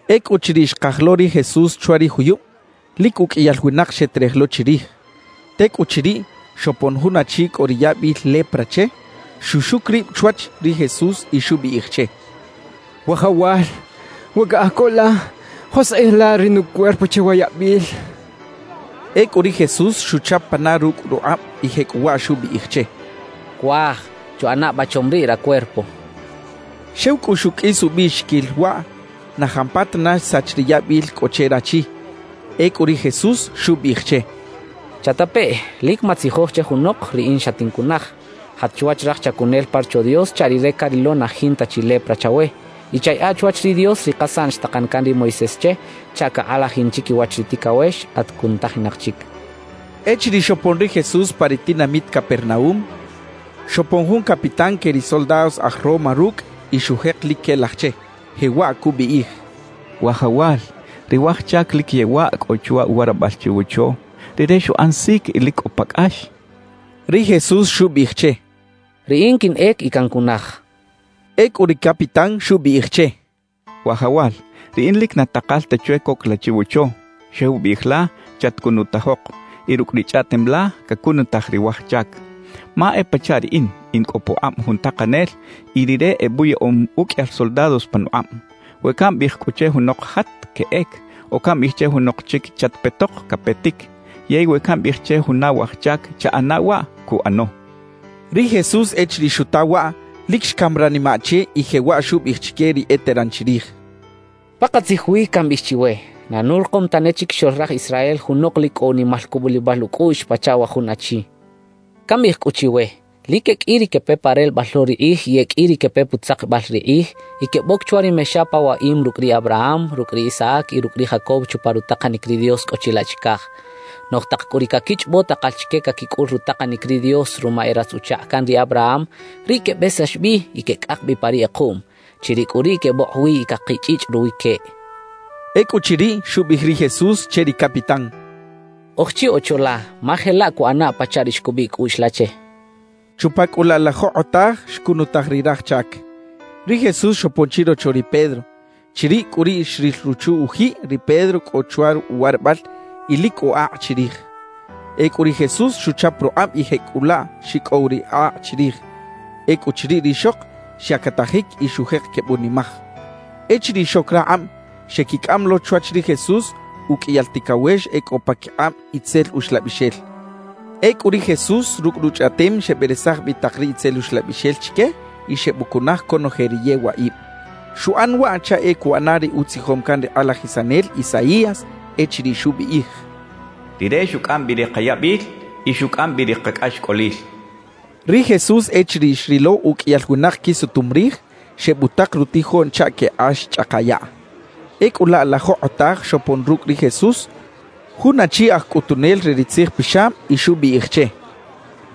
Ecꞌuchiriꞌ xkaj lo ri Jesús chwa ri juyub, lic uqꞌuiyal winak xeterej lo chirij. Tecꞌuchiriꞌ, xopon jun achi cꞌo ri yabil lepra che, xuxuc rib chwach ri Jesús y xubiꞌij che: —Wajawal, we caꞌaj co la, joskꞌij la ri nucuerpo che wa yabil —xchaꞌ. Ecꞌu ri Jesús xuchap pana rucꞌ rukꞌab y jecꞌuwaꞌ xubiꞌij che: —Cuaj, chuꞌana ba chom riꞌ racuerpo —xchaꞌ. Xew cꞌu xuqꞌuis ubiꞌxiquil waꞌ, na jampatana xsach ri yabil cꞌo che rachi. Ecꞌu ri Jesús xubiꞌij che: —Chatapeꞌ, lic matzijoj che junok riꞌin xatincunaj. Jat chwach raj chacunel pa Rocho Dios chaꞌ rire carilo na jinta chi lepra chawe, y chayaꞌa chwach ri Dios ri kasaꞌn xtakan can ri Moisés che chaꞌ cakꞌalajin chiquiwach ri ticawex at cunutajinak chic —xchaꞌ. Echiriꞌ xopon ri Jesús pa ri tinamit Capernaúm, xopon jun capitán que ri soldados aj Roma rucꞌ y xujek lic quelaj che, jewaꞌ cubiꞌij: —Wajawal, ri waj chac lic yewaꞌ cꞌo chwa uwarabal chiwocho. Rire xuꞌan sic y lic cꞌo pa cꞌax —cachaꞌ. Ri Jesús xubiꞌij che: —Riꞌin quinꞌec y cancunaj —xchaꞌ. Ecꞌu ri capitán xubiꞌij che: —Wajawal, riꞌin lic na takal ta chwe coc la chiwocho. Xew biꞌij la: “Chatcunutajok”, y rucꞌ ri chꞌaꞌtem la, cacunutaj ri waj chac. Ma e pachaꞌ riꞌin, in cꞌo pukꞌab jun takanel y rire ebuyaꞌom uqꞌuiyal soldados panukꞌab. We cambiꞌij cꞌu che junok “Jat”, queꞌec; o cambiꞌij che junok chic “Chatpetok”, capetic. Yey we cambiꞌij che juna waj chac “Chaꞌana waꞌ”, cuꞌano —xchaꞌ. Ri Jesús echiriꞌ xuta waꞌ, lic xcam ranimaꞌ che y jewaꞌ xubiꞌij chique ri eteran chirij: —Pakatzij wi cambiꞌij chiwe: Na nurikom tane chiquixoꞌl raj Israel junok lic cꞌo unimal cubulibal ucꞌuꞌx pachaꞌ wa jun achi. Cambiꞌij cꞌu chiwe: Lic e qꞌui ri quepe pa relebal lo ri kꞌij y e qꞌui ri quepe putzakibal ri kꞌij y queboc chwa ri mexa pa waꞌim rucꞌ ri Abraham, rucꞌ ri Isaac y rucꞌ ri Jacob chupa rutakanic ri Dios cꞌo chilaꞌ chicaj. Noꞌj tak cꞌu ri caquichꞌobo takal chique caquicꞌul rutakanic ri Dios ruma e ratz-uchakꞌ can ri Abraham, riꞌ quebesax bi y quecꞌak bi pa ri kꞌekuꞌm; chiriꞌ cꞌu riꞌ quebokꞌ wi y cakichꞌichꞌ ruwi queꞌ —xchaꞌ. Ecꞌuchiriꞌ, xubiꞌij ri Jesús che ri capitán: —Oj chi ocho la, ma jelaꞌ cuꞌanaꞌ pachaꞌ ri xcubiꞌ cꞌuꞌx la che —xchaꞌ. Chupa cꞌu laꞌ la jokꞌotaj xcunutaj ri raj chac. Ri Jesús xopon chirocho ri Pedro. Chiriꞌ cꞌu riꞌ xril ruchu-ujiꞌ ri Pedro cꞌo chwa uwarabal y lic cꞌo akꞌ chirij. Ecꞌu ri Jesús xuchap rukꞌab y jecꞌulaꞌ xicꞌow ri akꞌ chirij. Ecꞌuchiriꞌ, rixok xyactajic y xujek quebunimaj. Echiriꞌ xoc rakꞌab, xequicꞌam lo chwach ri Jesús uqꞌuiyal ticawex e cꞌo paquikꞌab itzel uxlabixel. Ecꞌu ri Jesús rucꞌ ruchꞌaꞌtem xeberesaj bi tak ri itzel uxlabixel chique y xebucunaj conoje ri yewaꞌib. Xuꞌan waꞌ chaꞌ e cuꞌana ri utzijom can ri kꞌalajisanel Isaías echiriꞌ xubiꞌij: Rire xucꞌam bi ri kayabil, y xucꞌam bi ri kacꞌaxcꞌolil xchaꞌ. Ri Jesús echiriꞌ xrilo uqꞌuiyal winak quisutum rij, xebutak rutijoꞌn chaꞌ quekꞌax chꞌaka yaꞌ. Ecꞌu laꞌ la jokꞌotaj xopon rucꞌ ri Jesús jun achi aj cꞌutunel re ri tzijpixab y xubiꞌij che: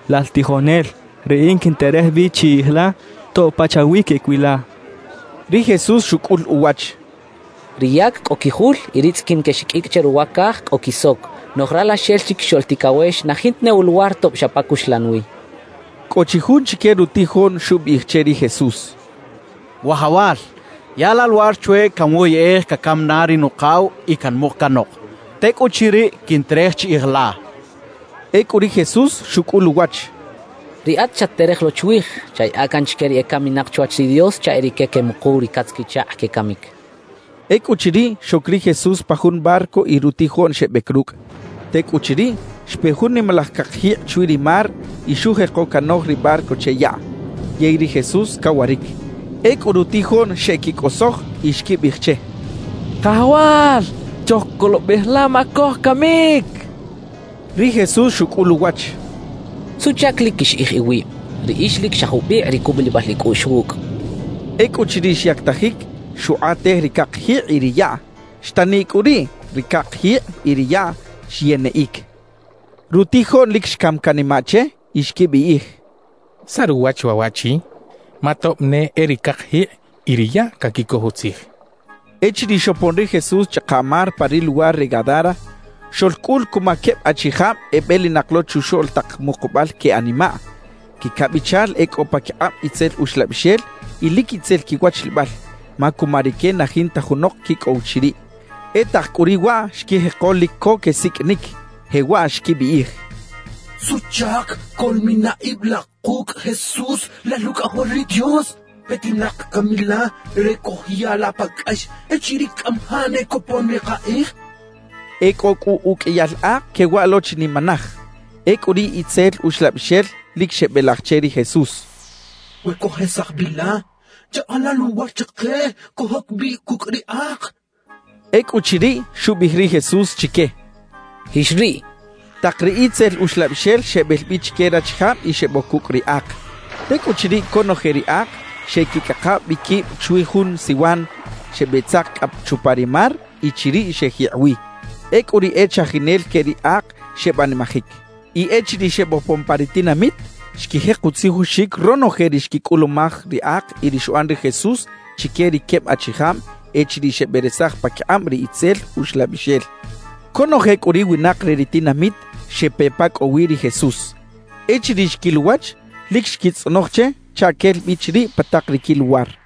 —Lal tijonel, riꞌin quinterej bi chiꞌij la tob pachawi queꞌec wi la —xchaꞌ. Ri Jesús xucꞌul uwach: —Ri yac cꞌo quijul y ri tzꞌiquin quexiqꞌuicꞌ che ruwa caj cꞌo quisoc; noꞌj Ralaxel Chiquixoꞌl Ticawex na jinta ne uluwar tob xa pa cuxlan wi —xchaꞌ. Cꞌo chi jun chique rutijoꞌn xubiꞌij che ri Jesús: —Wajawal, yaꞌa la luwar chwe canwoyꞌej cacam na ri nukaw y canmuk canok; tecꞌuchiriꞌ, quinterej chiꞌij la —xchaꞌ. Ecꞌu ri Jesús xucꞌul uwach: —Riꞌat chat-terej lo chwij; chayaꞌa can chique ri ecaminak chwach ri Dios chaꞌ e rique quemukuw ri catz-quichakꞌ quecamic —xchaꞌ. Ecꞌuchiriꞌ, xoc ri Jesús pa jun barco y rutijoꞌn xebec rucꞌ. Tecꞌuchiriꞌ, xpe jun nimalaj cakjikꞌ chwi ri mar y xujeko canoj ri barco che yaꞌ. Yey ri Jesús cawaric. Ecꞌu rutijoꞌn xeꞌquicꞌosoj y xquibiꞌij che: —¡Kajawal! ¡Chojcolobej la, ma cojcamic! —xechaꞌ. Ri Jesús xucꞌul uwach: —¿Suꞌchac lic quixiꞌij iwib? Riꞌix lic xa jubikꞌ ri cubulibal icꞌuꞌx wucꞌ —xchaꞌ. Ecꞌuchiriꞌ xyactajic, xukꞌatej ri cakjikꞌ y ri yaꞌ. Xtaniꞌ cꞌu riꞌ ri cakjikꞌ y ri yaꞌ xyeniꞌic. Rutijoꞌn lic xcam canimaꞌ che y xquibiꞌij: «¿Saꞌ ruwach waꞌ waꞌchi? ¡Ma tob ne e ri cakjikꞌ y ri yaꞌ caquicoj utzij!» xechaꞌ. Echiriꞌ xopon ri Jesús chꞌaka mar pa ri luwar re Gadara, xoꞌlcꞌul cuma queb achijab ebelinak lo chuxoꞌl tak mukubal que animaꞌ. Quicabichal e cꞌo paquikꞌab itzel uxlabixel y lic itzel quiwachlibal, ma cuma rique na jinta junok quicꞌow chiriꞌ. E tak cꞌu riꞌ waꞌ xquijeko lic co quesiqꞌuinic, jewaꞌ xquibiꞌij: —¿Suꞌchac coꞌlmina ib la kucꞌ, Jesús, Lal Ucꞌajol ri Dios? ¿Petinak cami la re cojya la pa cꞌax echiriꞌ cꞌamajaꞌ ne copon ri kakꞌij? —xechaꞌ. E cꞌo cꞌu uqꞌuiyal ak quewaꞌ lo chinimanaj. Ecꞌu ri itzel uxlabixel lic xebelaj che ri Jesús: —We cojesaj bi la, yaꞌa la luwar chike cojoc bi cucꞌ ri ak —xechaꞌ. Ecꞌuchiriꞌ, xubiꞌij ri Jesús chique: —Jix riꞌ —xchaꞌ. Tak ri itzel uxlabixel xebel bi chique rachijab y xeboc cucꞌ ri ak. Tecꞌuchiriꞌ, conoje ri ak xeꞌquicꞌaka bi quib chwi jun siwan, xebeꞌtzaka cꞌa chupa ri mar y chiriꞌ xejikꞌ wi. Ecꞌu ri e chajinel que ri ak xebanimajic. Y echiriꞌ xebopon pa ri tinamit, xquijek utzijoxic ronoje ri xquicꞌulumaj ri ak y ri xuꞌan ri Jesús chique ri queb achijab echiriꞌ xeberesaj paquikꞌab ri itzel uxlabixel. Conoje cꞌu ri winak re ri tinamit xepe pa cꞌo wi ri Jesús. Echiriꞌ xquil uwach, lic xquitzꞌonoj che chaꞌ quel bi chiriꞌ pa tak ri quiluwar.